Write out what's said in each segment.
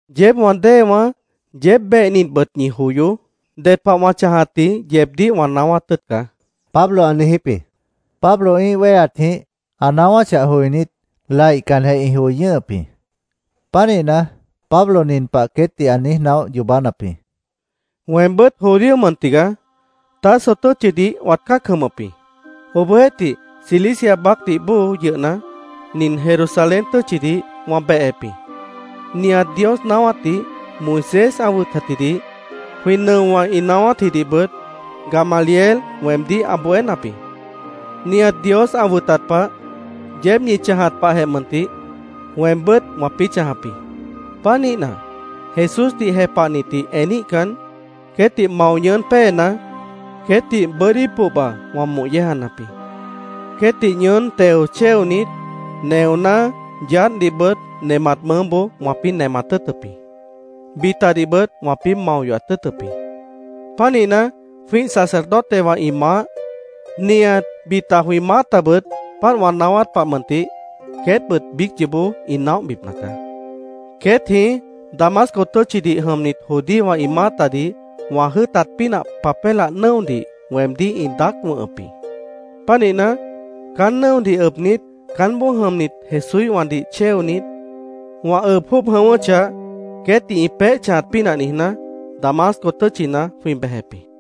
“Yeéb wã déewãá, yeéb behnitbʉt ñi joyoó. Ded pah wã chãjatji yeebdíh wã naáwát tʉ́ʉt caá”, Pablo ã niijíp jĩ. Pablo ĩ́ih wéheatjĩh ã naáwáchah joinít, laihcanjeh ĩ joi ñʉ́hʉp jĩ. Pánihna, Pablo nin pah queétdih ã niíj naóh yoobánap jĩ: “Weembʉ́t judío mʉn tigaá. Tarso tʉ́tchidih wãt cã́ac jʉmʉp jĩ. Obohjeéhtih, Cilicia baácdih bóo yʉhna, nin Jerusalén tʉ́tchidih wã behep jĩ. Nihat Dios naáwátdih, Moisés ã wʉtatjidih, jwĩ nʉowã ĩ naáwátjidihbʉt Gamaliel weemdíh ã bohénap jĩ. Nihat Dios ã wʉtat pah, yeéb ñi chãjat pahjeh mʉntih, weembʉ́t wãpĩ́ chãjap jĩ. Pánihna, Jesúsdih jepahnitdih eníhcan, queétdih mao ñʉʉ́n péena, queétdih bʉ́dí pohba wã moh yéejanap jĩ. Queétdih ñʉʉ́n teo chéonit, neoná, yaádhdihbʉt nemat mʉʉ́boó wãpĩ́ nemat tʉ́ʉtʉp jĩ. Bitadihbʉt wãpĩ́ mao yohat tʉ́ʉtʉp jĩ. Pánihna, jwĩ́ih sacerdotewã ĩ maáh, nihat bita jwĩ maátabʉt páant wã naáwát pah mʉntih queétbʉt biíc yoobó ĩ naóhbipna caá. Queét jĩí Damasco tʉ́tchidih jʉmnit judíowã ĩ maátadih wã jʉ́ʉtat pínah papélah nʉ́odih weemdíh ĩ daác wʉ̃hʉp jĩ. Pánihna, caán nʉ́odih ʉbnit, caánboó jʉmnit Jesúíhwãdih chéonit, wã ʉb jwʉ́ʉb jʉ̃ʉ́wʉ́chah, queétdih ĩ peéh chãjat pínah niijná, Damasco tʉ́tchina jwĩ bejep jĩ.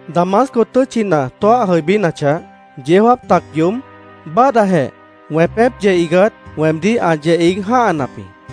“Damasco tʉ́tchina tóah jʉibínachah, yeó jáap tac yoób, báadhdajeh wẽpép yeh iigát weemdíh ã yeh iíg jã́hanap jĩ.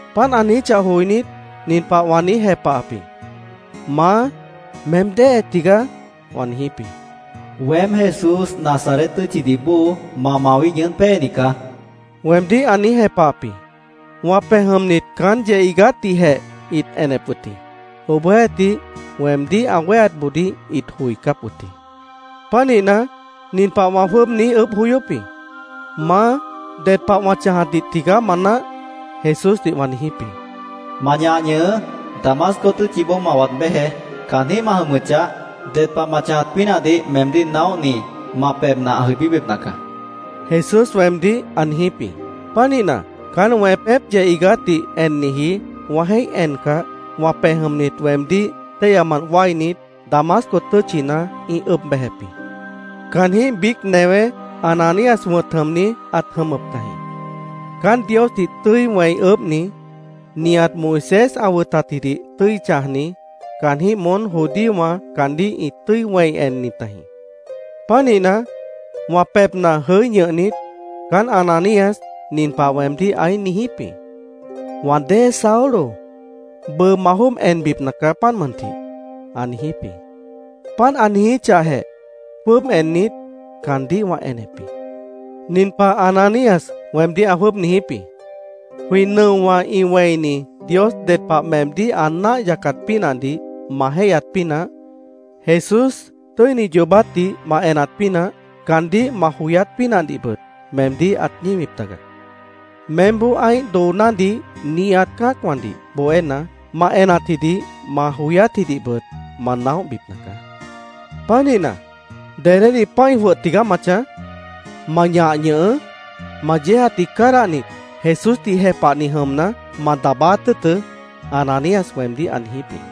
Páant ã niijíchah joinít, nin pah wã niíj jepahap jĩ: ‘¿Maá, meém déhe tigaá?’ wã niijíp jĩ. ‘Weém Jesús Nazaret tʉ́tchidih bóo ma mawíh ñʉʉ́n péeni caá’, weemdíh ã niíj jepahap jĩ. Wã pej jʉmnit caán yeh iigátdihjeh ĩt enep wʉt jĩ. Obohjeéhtih, weemdíh ã wéheatboodíh ĩt joicáp wʉt jĩ. Pánihna, nin pah wã jwʉ́ʉb niíj ʉʉ́bh joyóp jĩ: ‘¿Maá, ded pah wã chãjatdih tigaá ma náah?’ Jesúsdih wã niijíp jĩ. ‘Ma ñah ñʉhʉʉ́. Damasco tʉ́tchiboó ma waad béjeé. Caanjĩ́h ma jʉmʉchah, ded pah ma chãjat pínahdih meemdíh naóhni ma pebhna ã jʉibíbipna caá’, Jesús weemdíh ã niijíp jĩ. Pánihna, caán wẽpép yeh iigátdih enniji wã jéih encah, wã pej jʉmnit weemdíh téihyamant wáinit, Damasco tʉ́tchina ĩ ʉb bejep jĩ. “Caanjĩ́h biíc newé Ananías wʉ̃t jʉmni ãt jʉmʉp tajĩ. Caán Diosdih tʉ́i wẽi ʉʉ́bhni, nihat Moisés ã wʉtatjidih tʉ́i chãjni, caanjĩ́h moón judíowã caandíh ĩ tʉ́i wẽi enni tajĩ. Pánihna, wã pebhna jʉí ñʉhnit, caán Ananías nin pah weemdíh ãí niijíp jĩ. ‘Wã dée Saulo, bʉʉ ma jwʉ́ʉb enbipna caá, páant mʉntih’, ã niijíp jĩ. Páant ã niijíchahjeh, jwʉ́ʉb ennit, caandíh wã enep jĩ. Nin pah Ananías weemdíh ã jwʉ́ʉb niijíp jĩ: ‘Jwĩ nʉowã ĩ wẽini Dios ded pah meemdíh ã náah yacat pínahdih ma jéihyat pínah, Jesús tʉ́ini yoobátdih ma enat pínah, caandíh ma joyát pínahdihbʉt, meemdíh ãt ñíwip taga. Meémboó ã́ih doonádih nihat cã́acwãdih bohéna, ma enatjidih ma joyátjidihbʉt ma naóhbipna caá. Pánihna, ¿dedédih pã́i jwʉh tigaá ma chãj? ¡Ma ñah ñʉhʉʉ́! Ma yéejatdih cádahnit, Jesúsdih jepahni jʉmna, ma daabáát tʉ́ʉtʉ́’, Ananías weemdíh ã niijíp jĩ.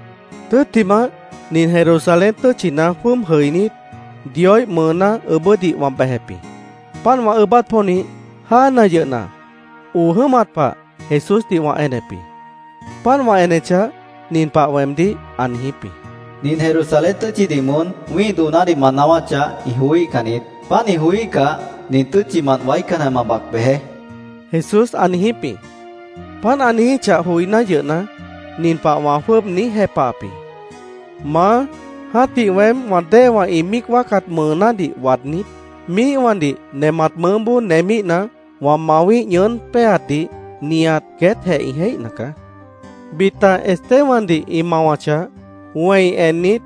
“Tʉ́ttimah, nin Jerusalén tʉ́tchina jwʉ́ʉb jʉinít, Dioíh mʉʉná ʉʉ́bʉ́dih wã bejep jĩ. Páant wã ʉʉ́bát pónih, jáana yʉhna, oo jʉ́mat pah Jesúsdih wã enep jĩ. Páant wã enechah, nin pah weemdíh ã niijíp jĩ: ‘Nin Jerusalén tʉ́tchidih moón wĩ́ih doonádih ma naáwáchah, ĩ joííhcan niít. Páant ĩ joííhcah, nin tʉ́tchimant waícanjeh ma bac bejeé’, Jesús ã niijíp jĩ. Páant ã niijíchah joiná yʉhna, nin pah wã jwʉ́ʉb niíj jepahap jĩ: ‘Maá, jã́tih weém wã déewã ĩ míic wáacat mʉʉnádih waadnít, míihwãdih nemat mʉʉ́boó nemíhna, wã mawíh ñʉʉ́n péeatdih nihat queétjeh ĩ jéihna caá. Bita Estebandih ĩ mawachah, wẽi ennit,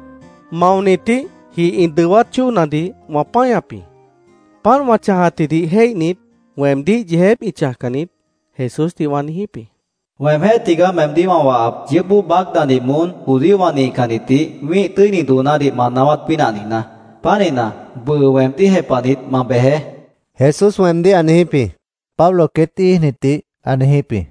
maonitíh jih ĩ dʉwát chóonadih wã páñap jĩ. Páant wã chãjatjidih jéihnit, weemdíh yeejép ĩ chãjcan niít’, Jesúsdih wã niijíp jĩ. ‘Weemjéh tigaá meemdíh wã wahap, yʉʉ́p bóo baácnadih moón judíowã nihcannitdih wĩ́ih tʉ́ini doonádih ma naáwát pínah niijná. Pánihna, bʉʉ weemdíh jepahnit, ma bejeé’, Jesús weemdíh ã niijíp jĩ”, Pablo queét íijnitdih ã niijíp jĩ.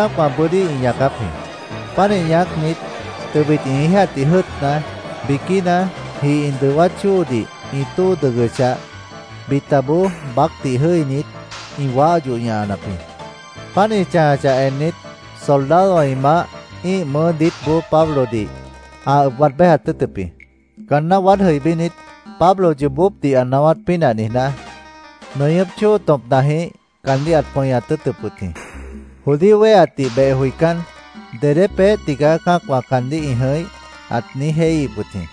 Nihat cã́acwã bʉ́dí ĩ ñaacáp jĩ. Pánih ñaácnit, tʉbit ĩ íijatdih jʉ́ʉtna, biquína jih ĩ dʉwát chóodih ĩ tóo dʉg yohochah, bitaboó baácdih jʉ́init, ĩ waáh yoh ñahanap jĩ. Páant ĩ chãjachah ennit, soldadowã ĩ maáh ĩ́ih mʉʉ́ diítboó Pablodih ã ʉb waad béjat tʉ́ʉtʉp jĩ. Caanná waád jʉibínit, Pablo yoobópdih ã naáwát pínah niijná, nʉñʉ́p chóo tõpnajĩh caandíh ãt pʉñat tʉ́ʉtʉp wʉt jĩ. Judío wéheatdih beh joicán, “¿Dedé peéh tigaá cã́acwã caandíh ĩ jʉ̃ih?” ãt niíj jéihíhip wʉt jĩ.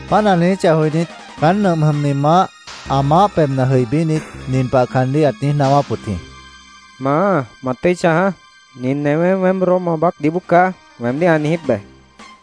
Páant ã niijíchah joinít, caán nʉmp jʉmni maáh ã maáh pebhna jʉibínit, nin pah caandíh ãt niíj naáwáp wʉt jĩ: —¡Maá, ma tʉ́i chãjaá! Nin newé ‘Weém Roma baácdih bóo caá’, weemdíh ã niijíp be, ãt niijíp wʉt jĩ.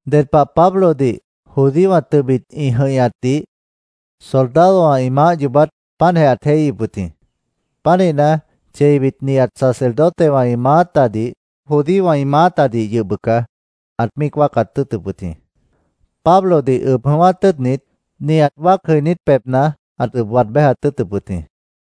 Ded pah Pablodih judíowã tʉbit ĩ jʉ̃ihñatdih soldadowã ĩ maáh yoobát páantjeh ãt jéihíhip wʉt jĩ. Pánihna, cheibit nihat sacerdotewã ĩ maátadih, judíowã ĩ maátadih yʉh bʉca ãt míic wáacat tʉ́ʉtʉp wʉt jĩ. Pablodih ʉb jʉ̃ʉ́wát tʉ́ʉtnit, nihat wáac jʉinít pebhna ãt ʉb waad béjat tʉ́ʉtʉp wʉt jĩ.